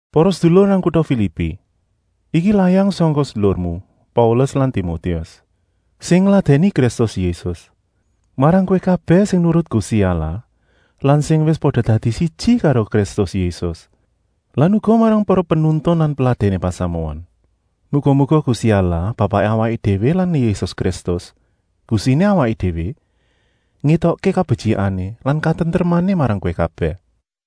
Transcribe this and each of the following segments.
Para sedulur nang kuta Filipi, iki layang sangka sedulurmu Paulus lan Timotius, sing ngladèni Kristus Yésus, marang kowé kabèh sing nurut Gusti Allah lan sing wis pada dadi siji karo Kristus Yésus lan uga marang para penuntun lan peladèné pasamuan. Muga-muga Gusti Allah Bapaké awaké déwé lan Yésus Kristus, Gustiné awaké déwé, ngétokké kabetyikané lan katentremané marang kowé kabèh.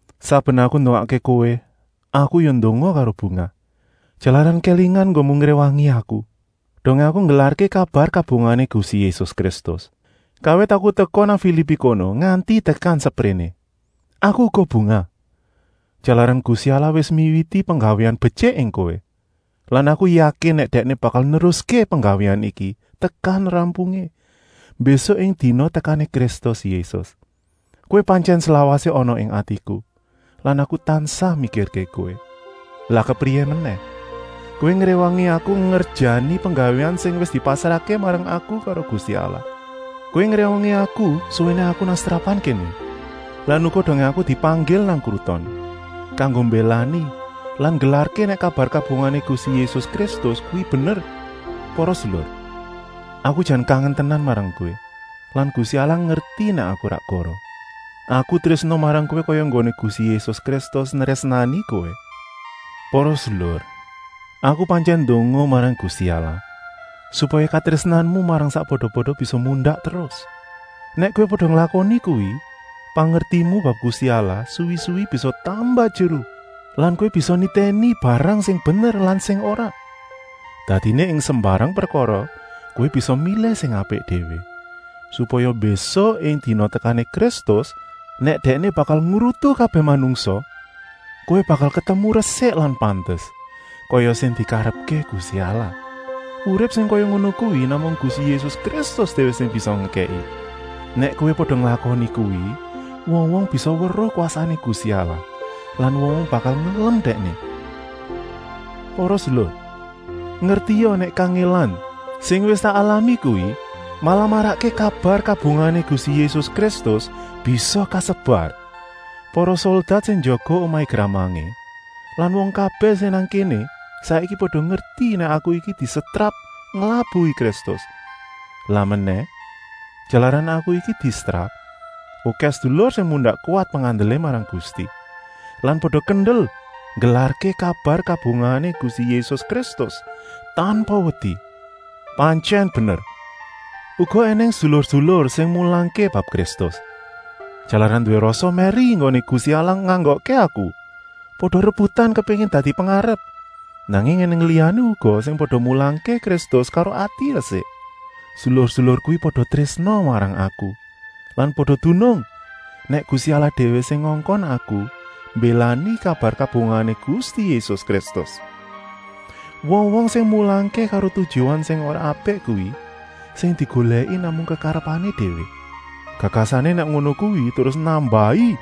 Saben aku ndongakké kowé aku ya ndonga karo bungah, jalaran kélingan enggonmu ngréwangi aku, dongé aku nggelarké kabar kabungahané Gusti Yésus Kristus, kawit aku teka nang Filipi kono nganti tekan sepréné. Aku uga bungah, jalaran Gusti Allah wis miwiti penggawéan betyik ing kowé. Lan aku yakin nèk Dèkné bakal neruské penggawéan iki tekan rampungé, mbésuk ing dina tekané Kristus Yésus. Kowé pantyèn slawasé ana ing atiku lan aku tansah mikirké kowé. Lah kepriyé menèh! Kowé ngréwangi aku ngerjani penggawéan sing wis dipasrahké marang aku karo Gusti Allah. Kowé ngréwangi aku suwéné aku nang setrapan kéné lan uga dongé aku dipanggil nang kruton, kanggo mbélani lan nggelarké nèk kabar kabungahané Gusti Yésus Kristus kuwi bener. Para sedulur, aku jan kangen tenan marang kowé lan Gusti Allah ngerti nèk aku ora goroh. Aku trésna marang kowé kaya enggoné Gusti Yésus Kristus nrésnani kowé. Para sedulur, aku pantyèn ndonga marang Gusti Allah, supaya katrésnanmu marang sakpada-pada bisa mundak terus. Nèk kowé pada nglakoni kuwi, pangertimu bab Gusti Allah suwi-suwi bisa tambah jeru lan kowé bisa nitèni barang sing bener lan sing ora. Dadiné ing sembarang prekara kowé bisa milih sing apik déwé, supaya mbésuk ing dina tekané Kristus, nèk Dèkné bakal ngrutu kabèh manungsa, kowé bakal ketemu resik lan pantes, kaya sing dikarepké Gusti Allah. Urip sing kaya ngono kuwi namung Gusti Yésus Kristus déwé sing bisa ngekèki. Nèk kowé pada nglakoni kuwi, wong-wong bisa weruh kwasané Gusti Allah lan wong-wong bakal ngelem Dèkné. Para sedulur, ngertia nèk kangèlan sing wis tak alami kuwi malah marakké kabar kabungahané Gusti Yésus Kristus bisa kasebar. Para soldat sing njaga omahé gramangé lan wong kabèh sing nang kéné saiki pada ngerti nèk aku iki disetrap nglabuhi Kristus. Lan menèh, jalaran aku iki disetrap, okèh sedulur sing mundak kuwat pengandelé marang Gusti lan pada kendel nggelarké kabar kabungahané Gusti Yésus Kristus, tanpa wedi. Pantyèn bener, uga ènèng sedulur-sedulur sing mulangké bab Kristus, jalaran nduwé rasa mèri enggoné Gusti Allah nganggokké aku, pada rebutan kepéngin dadi pengarep. Nanging ènèng liyané uga sing pada mulangké Kristus karo ati resik. Sedulur-sedulur kuwi pada trésna marang aku lan pada dunung nèk Gusti Allah déwé sing ngongkon aku mbélani kabar kabungahané Gusti Yésus Kristus. Wong-wong sing mulangké karo tujuan sing ora apik kuwi sing digolèki namung kekarepané déwé. Gagasané nèk ngono kuwi terus nambahi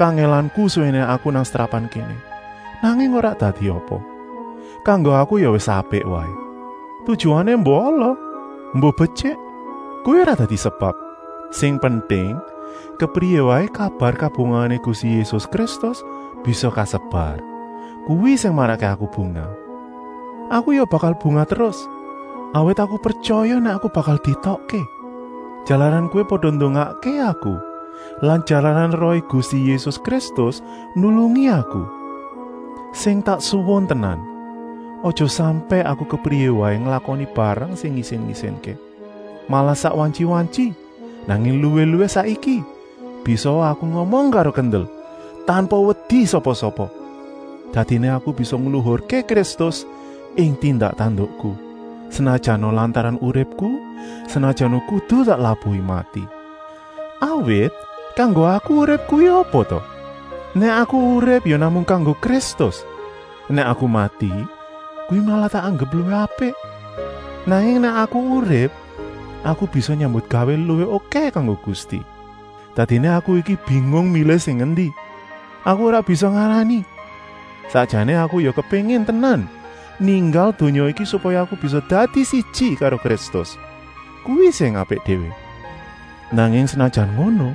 kangèlanku suwéné aku nang setrapan kéné. Nanging ora dadi apa! Kanggo aku ya wis apik waé. Tujuané embuh ala, embuh betyik, kuwi ora dadi sebab. Sing penting, kepriyé waé kabar kabungahané Gusti Yésus Kristus bisa kasebar. Kuwi sing marakké aku bungah. Aku ya bakal bungah terus, awit aku pretyaya nèk aku bakal dietokké, jalaran kowé pada ndongakké aku lan jalaran Rohé Gusti Yésus Kristus nulungi aku. Sing tak suwun tenan, aja sampèk aku kepriyé waé nglakoni barang sing ngisin-isinké. Malah sak wantyi-wantyi, nanging luwih-luwih saiki, bisaa aku ngomong karo kendel, tanpa wedi sapa-sapa. Dadiné aku bisa ngluhurké Kristus ing tindak-tandukku, senajana lantaran uripku, senajana kudu tak labuhi mati. Awit, kanggo aku urip kuwi apa ta? Nèk aku urip ya namung kanggo Kristus. Nèk aku mati, kuwi malah tak anggep luwih apik. Nanging nèk aku urip, aku bisa nyambutgawé luwih okèh kanggo Gusti. Dadiné aku iki bingung milih sing endi. Aku ora bisa ngarani! Sakjané aku ya kepéngin tenan ninggal donya iki supaya aku bisa dadi siji karo Kristus; kuwi sing apik déwé. Nanging senajan ngono,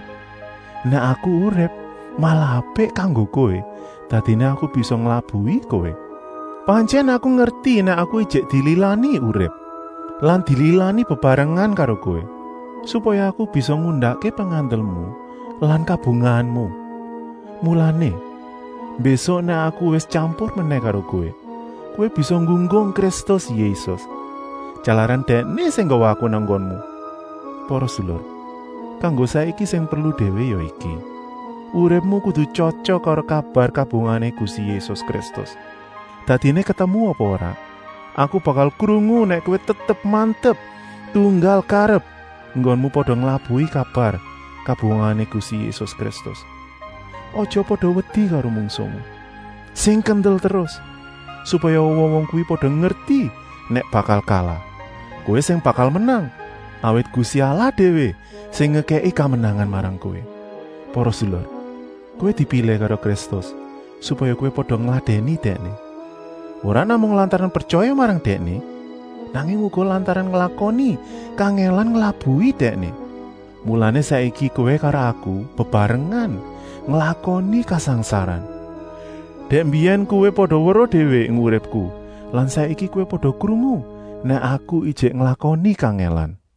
nèk aku urip malah apik kanggo kowé, dadiné aku bisa nglabuhi kowé. Pantyèn aku ngerti nèk aku ijik dililani urip lan dililani bebarengan karo kowé, supaya aku bisa ngundakké pengandelmu lan kabungahanmu. Mulané, mbésuk nèk aku wis tyampur menèh karo kowé, kowé bisa nggunggung Kristus Yésus, jalaran Dèkné sing nggawa aku nang nggonmu. Para sedulur, kanggo saiki sing perlu déwé ya iki: uripmu kudu tyotyok karo kabar kabungahané Gusti Yésus Kristus. Dadiné ketemu apa ora, aku bakal krungu nèk kowé tetep mantep tunggal karep enggonmu pada nglabuhi kabar kabungahané Gusti Yésus Kristus. Aja pada wedi karo mungsuhmu! Sing kendel terus, supaya wong-wong kuwi pada ngerti nèk bakal kalah. Kowé sing bakal menang, awit Gusti Allah déwé sing ngekèki kamenangan marang kowé. Para sedulur, kowé dipilih karo Kristus supaya kowé pada ngladèni Dèkné. Ora namung lantaran pretyaya marang Dèkné, nanging uga lantaran nglakoni kangèlan nglabuhi Dèkné. Mulané saiki kowé karo aku bebarengan nglakoni kasangsaran. Dèk mbiyèn kowé pada weruh déwé ing uripku lan saiki kowé pada krungu nèk aku ijik nglakoni kangèlan.